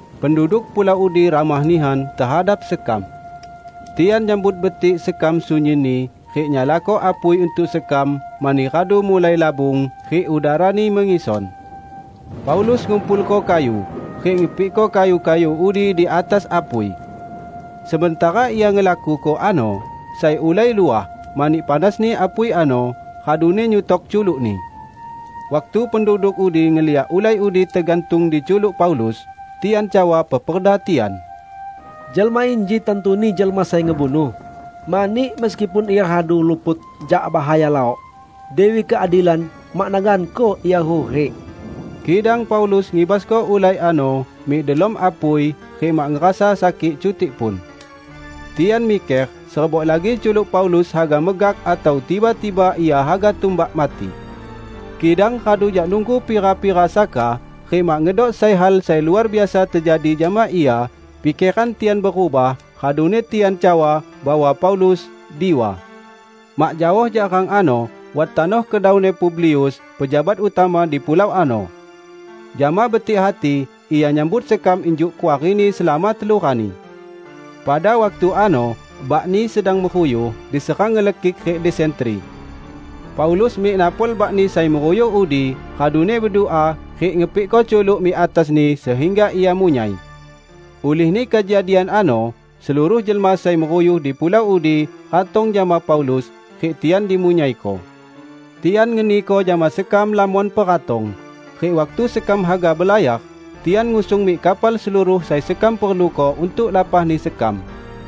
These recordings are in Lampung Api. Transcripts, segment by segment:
Penduduk pulau udi ramah nihan tehadap sekam. Tian nyambut betik sekam sunyinni rik nyalako apui untuk sekam mani radu mulai labung rik udarani mengison. Paulus ngumpulko kayu, rik ngepikko kayu-kayu udi di atas apui. Sementara ia ngelakuko ano, sai ulai luah, mani panasni apui ano, raduni nyutok culukni. Waktu penduduk pulau udi ngeliak ulai udi tegantung di culuk Paulus, tian cawa peperda tian, "Jelma inji tantuni jelma sai ngebunuh, mani meskipun ia radu luput jak bahaya laok, Dewi Keadilan mak naganko ia hurik." Kidang Paulus ngibasko ulai ano mik delom apui rik mak ngerasa sakik cutik pun. Tian miker serebok lagi culuk Paulus haga megak atau tiba-tiba ia haga tumbak mati. Kidang radu jak nunggu pira-pira saka rik mak ngedok sai hal sai luar biasa tejadi jama ia, pikeran tian berubah raduni tian cawa bahwa Paulus, diwa. Mak jaoh jak rang ano wat tanoh kedauni Publius, pejabat utama di pulau ano. Jama betik hati ia nyambut sekam injuk kuarini selama telu rani. Pada waktu ano bakni sedang meruyuh diserang ngelekik rik desentri. Paulus mik napol bakni sai meruyuh udi raduni bedua rik ngepikko culuk mik atasni sehingga ia munyai. Ulihni kejadian ano seluruh jelma sai meruyuh di pulau udi ratong jama Paulus, rik tian dimunyaiko. Tian ngeniko jama sekam lamon peratong, rik waktu sekam haga belayar, tian ngusung mik kapal seluruh sai sekam perluko untuk lapahni sekam.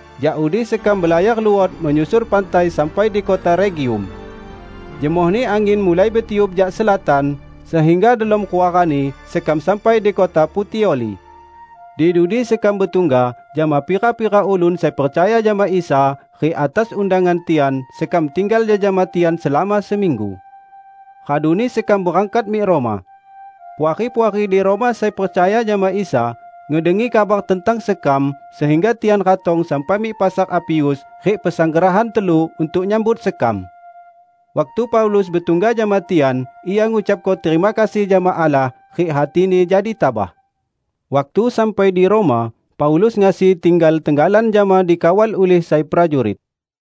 Jak udi sekam belayar luot menyusur pantai sampai di kota Regium. Jemohni angin mulai betiup jak selatan, sehingga delom rua rani sekam sampai di kota Putioli. Di dudi sekam betungga jama pira-pira ulun sai percaya jama Isa, rik atas undangan tian sekam tinggal jejama tian selama seminggu. Raduni sekam berangkat mik Roma. Puari-puari di Roma sai percaya jama Isa ngedengi kabar tentang sekam, sehingga tian ratong sampai mik Pasar Apius rik Pasanggrahan Telu untuk nyambut sekam. Waktu Paulus betungga jama tian, ia ngucapko terima kasih jama Allah rik hatini jadi tabah. Waktu sampai di Roma, Paulus ngasi tinggal tenggalan jama dikawal ulih sai prajurit.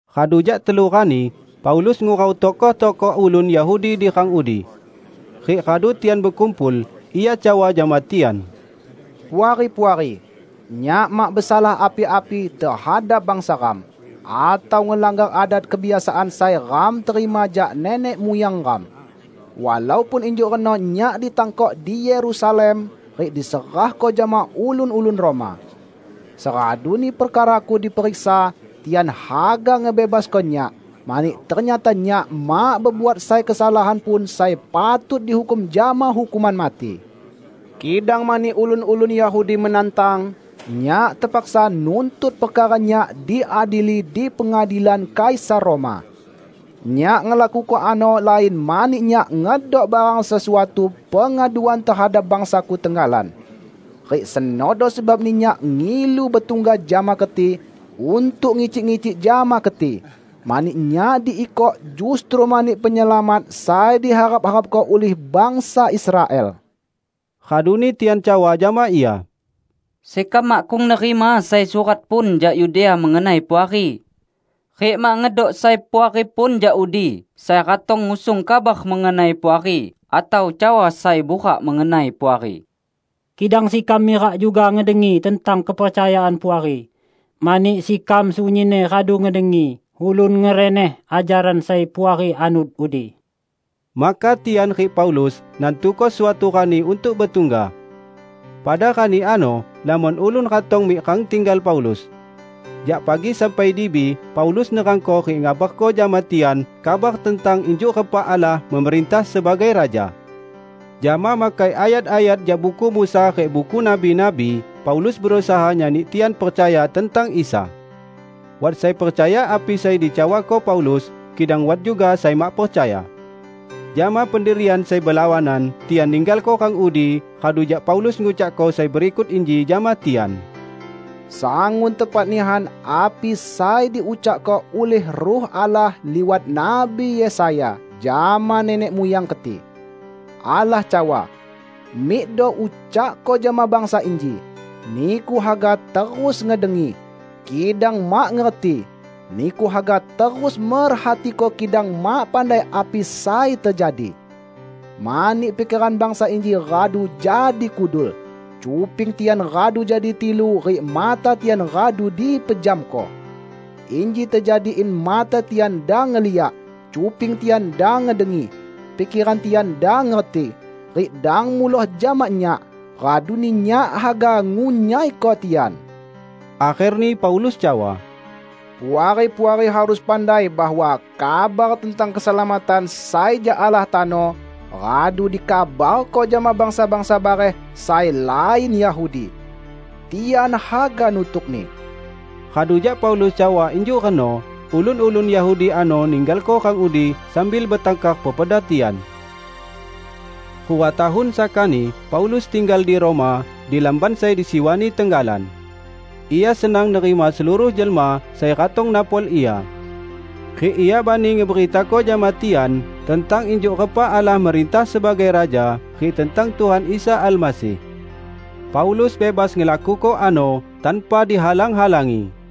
Radu jak telu rani, Paulus ngurau tokoh-tokoh ulun Yahudi di rang udi. Rik radu tian bekumpul, ia cawa jama tian, "Puari-puari! Nyak mak besalah api-api tehadap bangsa ram, atau ngelanggar adat kebiasaan sai ram terima jak nenek muyang ram. Walaupun injuk reno nyak ditangkok di Yerusalem rik diserahko jama ulun-ulun Roma. Seraduni perkaraku diperiksa, tian haga ngebebasko nyak, mani ternyata nyak mak bebuat sai kesalahan pun sai patut dihukum jama hukuman mati. Kidang mani ulun-ulun Yahudi menantang, nyak tepaksa nuntut perkara nyak diadili di pengadilan Kaisar Roma. Nyak ngelakuko ano lain mani nyak ngedok barang sesuatu pengaduan tehadap bangsaku tenggalan. Rik senodo sebabni nyak ngilu betungga jama keti untuk ngicik-ngicik jama keti; mani nyak diikok, justru mani Penyelamat sai diharap-harapko ulih bangsa Israel." Raduni tian cawa jama ia, "Sekam makkung nerima sai surat pun jak Yudea mengenai Puari. Rik mak ngedok sai puari pun jak udi sai ratong ngusung kabar mengenai Puari atau cawa sai burak mengenai Puari. Kidang sekam mirak juga ngedengi tentang kepercayaan Puari, mani sekam sunyinni radu ngedengi ulun ngereneh ajaran sai Puari anut udi." Maka tian rik Paulus nantuko suatu rani untuk betungga. Pada rani ano lamon ulun ratong mik rang tinggal Paulus. Jak pagi sampai dibi Paulus nerangko rik ngabarko jama tian kabar tentang injuk repa Allah memerintah sebagai Raja. Jama makai ayat-ayat jak Buku Musa rik Buku Nabi-nabi, Paulus berusaha nyani tian percaya tentang Isa. Wat sai percaya api sai dicawako Paulus, kidang wat juga sai mak percaya. Jama pendirian sai belawanan tian ninggalko rang udi, radu jak Paulus ngucakko sai berikut inji jama tian, "Sangun tepat nihan api sai diucakko ulih Ruh Allah liwat Nabi Yesaya jama nenek muyang keti! Allah cawa, 'Mikdo ucakko jama bangsa inji: Niku haga terus ngedengi, kidang mak ngerti; niku haga terus merhatiko kidang mak pandai api sai tejadi. Mani pikeran bangsa inji radu jadi kudul, cuping tian radu jadi tilu rik mata tian radu dipejamko. Inji tejadi in mata tian dang ngeliak, cuping tian dang ngedengi, pikeran tian dang ngerti, rik dang muloh jama Nyak, raduni Nyak haga ngunyaiko tian.' " Akherni Paulus cawa, "Puari-puari harus pandai bahwa kabar tentang keselamatan sai jak Allah tano radu dikabarko jama bangsa-bangsa bareh sai lain Yahudi. Tian haga nutukni!" [ Radu jak Paulus cawa injuk reno, ulun-ulun Yahudi ano ninggalko rang udi sambil betangkar peperda tian.] Rua tahun sakani Paulus tinggal di Roma, di lamban sai disiwani tenggalan. Ia senang nerima seluruh jelma sai ratong napol ia. Rik ia bani ngeberitako jama tian tentang injuk repa Allah merintah sebagai Raja rik tentang Tuhan Isa Almasih. Paulus bebas ngelakuko ano, tanpa dihalang-halangi.